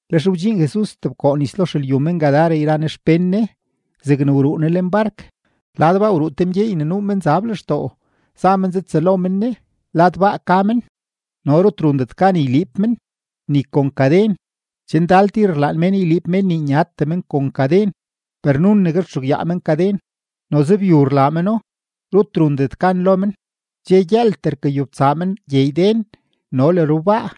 Lex wdxiin Jesus stebkoo nis lo xelyu men-Gadara yra Ne xpén Ne. Zegne wruu Ne lenbark, lad baa wruu te mgyeey ne nuu menzab lextoo, za men zatsëlo men Ne. Lad baa ka men, no rut rundet gan yliib men, ni kon kaden. Che ndal tir rlaan mén yliib mén nii nyatee men kon kaden, per nunegue rtxugyaa men kaden, noze byu rlaa meno; rut rundet gan lo men. Dxe gyëëltee, rkayobtsaa men gyeey den no le rubaa,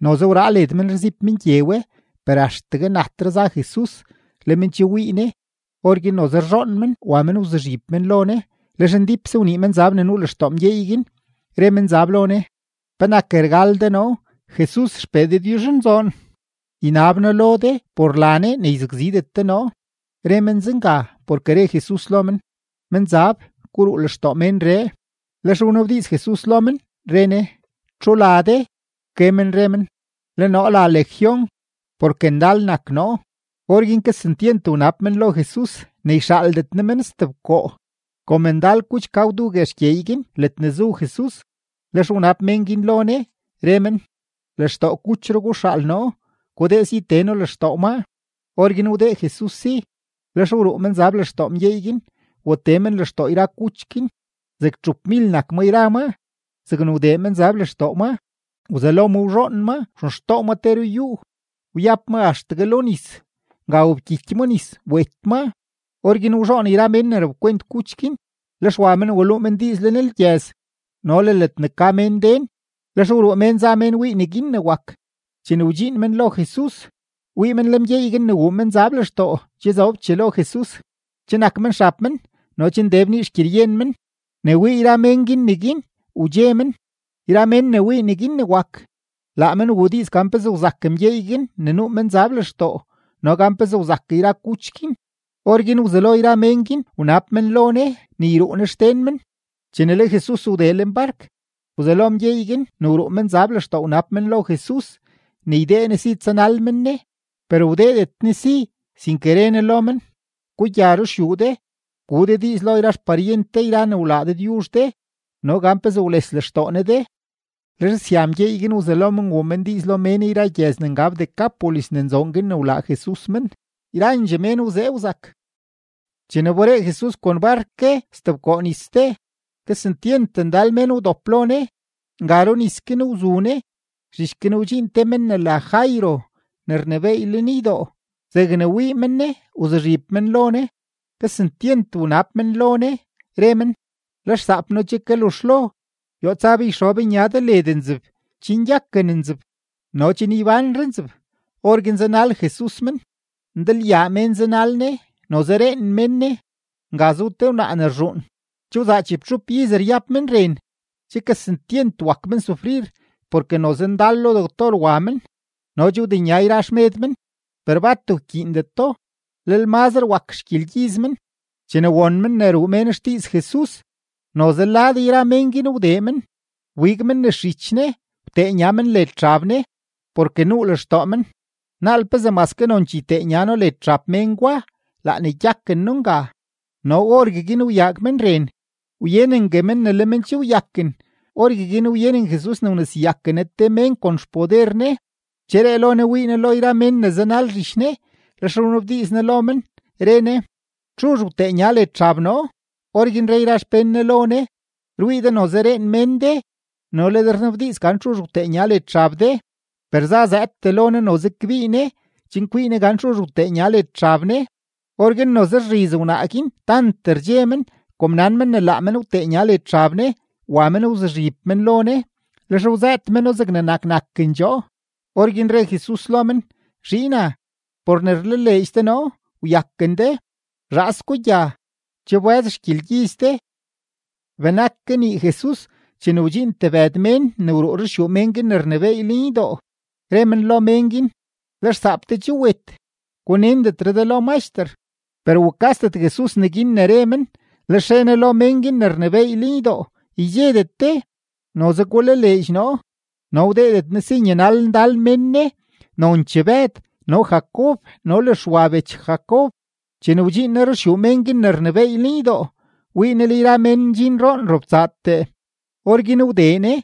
noze wraa led men rziib men gye we. Per axtegue natre za Jesus, le men che wii Ne; orguin noze rzhoon men wa men wzuzhib men lo Ne. Lex ndípse wnii menzab ne nuu lextoo mgyeey guin, re menzab lo Ne: ―¿Penak rgal de noo, Jesus XPee Dëdyuzhnzoon? Ynab noo lo de por la Ne ne yzakzidet de noo. Re men zenga porke re Jesus lo men: ―¡Menzab, guruu lextoo ménree! Lex wnabdiiz Jesus lo men, re Ne: ―¿Txu la de? Wke men re men: ―Le noo la Legión, porke ndal nak noo. Orguin kesentyent wnab men lo Jesus ne yxaaldet Ne men stebkoo. Kom ndal kuch ka gwdu guex gyeey guin ledne zu Jesus, lex wnab menzab guin lo Ne, re men: ―Lextoo kuchro guxaal noo; gudee si tee noo lextoo maa. Orguin wdee Jesus si. Lex wruu menzab lextoo mgyeey guin, watee menzab lextoo yra kuch guin. Zeg txupmil nak ma yra ma. Zegne wdee menzab lextoo maa, wzelo ma wzhoon maa wxenxtoo ma te ruyúú, wyab ma axtegue lo nis. Nga wobkyiky ma nis, wet maa. Orguin wzhoon yra mén ne rapkwent kuch guin, lex wa men waluu men diiz lenlgyëz no le ledne ka mén den. Lex wruu mén za men wii neguin ne wak. Chene wdxiin men lo Jesus, wii men le mgyeey guin ne wuu menzab lextoo che zobchee lo Jesus, che nak men xab men no che nde bnii xgyeryen men. Ne wii yra mén guin neguin, wdxe men. Yra mén ne wii neguin ne wak, laa men wuu diiz gan pezee wzak mgyeey guin ne nuu menzab lextoo no gan pezee wzak yra kuch guin. Orguin wzelo yra mén guin wnab men lo Ne ne yruu Ne xden men. Chene le Jesus wdee lenbark, wzelo mgyeey guin ne wruu menzab lextoo wnab men lo Jesus ne ydee Ne si tsanal men Ne. Per wdeedet Ne si, sinke re Ne lo men: ―Gugya ruxyuu de, gu de diiz lo yra xparyent de yra ne wlaa Dëdyuzh de no gan pezee wles lextoo Ne de. Lex sya mgyeey guin wzelo men wuu men diiz lo mén yra gyëz ne ngab Decápolis ne nzoon guin ne wlaa Jesus men. Yrandxee mén wzee wzak. Chene wberee Jesus kon bark ke stebkoo nis ste, kesentyent ndal mén wdop lo Ne. Nga runis guin wzu Ne. Zhich guin wdxiin te men ne la Jairo ne rnebééy lenydoo. Zegne wii men Ne, wzuzhib men lo Ne. Kesentyent wnab men lo Ne, re men: ―Le xsaap noo che kaluzhlo. Yoo tsa be yxob nya de led nzeb chen gyaken nzeb no chen ybánre nzeb. Orguin zanal Jesus men. Ndalyaa mén zanal Ne, noze reen men Ne. Nga zu te wnaa ne rzhuun, che wzaa chibtxup iz ryab men ren. Che kesentyent wak men sufrir porke noze ndal lo doctor wa men, no che wdenya yra xmed men, per bat wkyiindeto, lel mazre wak xgyelgyiz men. Chene won men ne ruu mén xdiiz Jesus, noze lad yra mén guin wdee men, wbig men nes zhich Ne, wtee nya men led xab Ne. Porke nuu lextoo men: “Naal pezee maske nonchee ytee nya noo led xab mén gwa, laa ne gyaken noo nga.” No orgueguin wyaag men ren, wyenengue men ne le men che wyaken. Orgueguin wyenen Jesus ne wneseyaken Ne te mén kon xpoder Ne. Wcheree lo Ne wii Ne lo yra mén ne zanal zhich Ne, lex wnabdiiz Ne lo men, re Ne: ―¿Txuzh wtee nya led xab noo? Orguin re yra xpén Ne lo Ne: ―Rwii de noze reen mén de, no le de rnabdiiz gan txuzh wtee nya led xab de. Per zazëëdtee lo Ne noze kbii Ne chen kwii Ne gan txuzh wtee nya led xab Ne. Orguin noze rzhiz wnaa guin tant rdxe men kom nan men ne laa men wtee nya led xab Ne. Wa men wzuzhib men lo Ne, lex wzëët meno zegne nak nakendxoo. Orguin re Jesus lo men: ―Zhiina, por ne wlaleedx de noo, wyaken de. Zhaas gugya, che wbë́z xgyelgyiz de. Benak kanii Jesus, chene wdxiin tebëd mén ne wruu ruxyuu mén guin ne rnebééy lenydoo, re men lo men guin: ―Le xsaap de che wet. Gunendetre de lo Maxter. Per wukasdet Jesus neguin ne re men, lex re Ne lo mén guin ne rnebééy lenydoo: ―Ydxedet de; noze gulaleedx noo. No wdeedet Ne si nyanal ndal mén Ne, nonchee Bëd no le Jacob no le Xwa bech Jacob. Chene wdxiin Ne ruxyuu mén guin ne rnebééy lenydoo, wii Ne le yra mén ndxin roon robtsaatee. Orguin wdee Ne,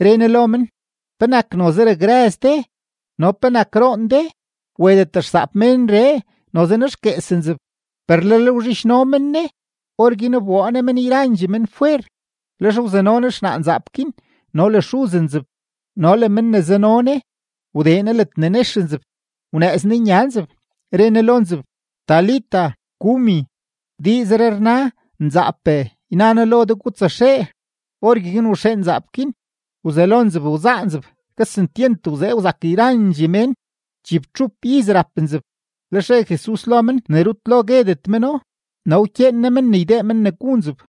re Ne lo men: ―¿Penak noze rakrëz de no penak roon de? Wetet xsaap ménree, noze nexguees nzeb. Per lel wzhidxno men Ne. Orguin wboo Ne men yrandxee men fwer. Lex wzano Ne xnaa nzaap guin no le xuz nzeb no le men ne zano Ne, wdee Ne ledne nex nzeb. Wnëëz Ne nya nzeb, re Ne lo nzeb: ―Talita, cumi ―diizree rna: Nzaape, yna noo lo de, gutsaxee. Orgueguin waxee nzaap guin, wzelo nzeb wzaa nzeb. Kesentyent wzee wzak yrandxee mén. Chibtxup iz rap nzeb. Lex re Jesus lo men ne rutlel lo guedet meno, no wkyeen Ne men ne ydee men ne gu nzeb.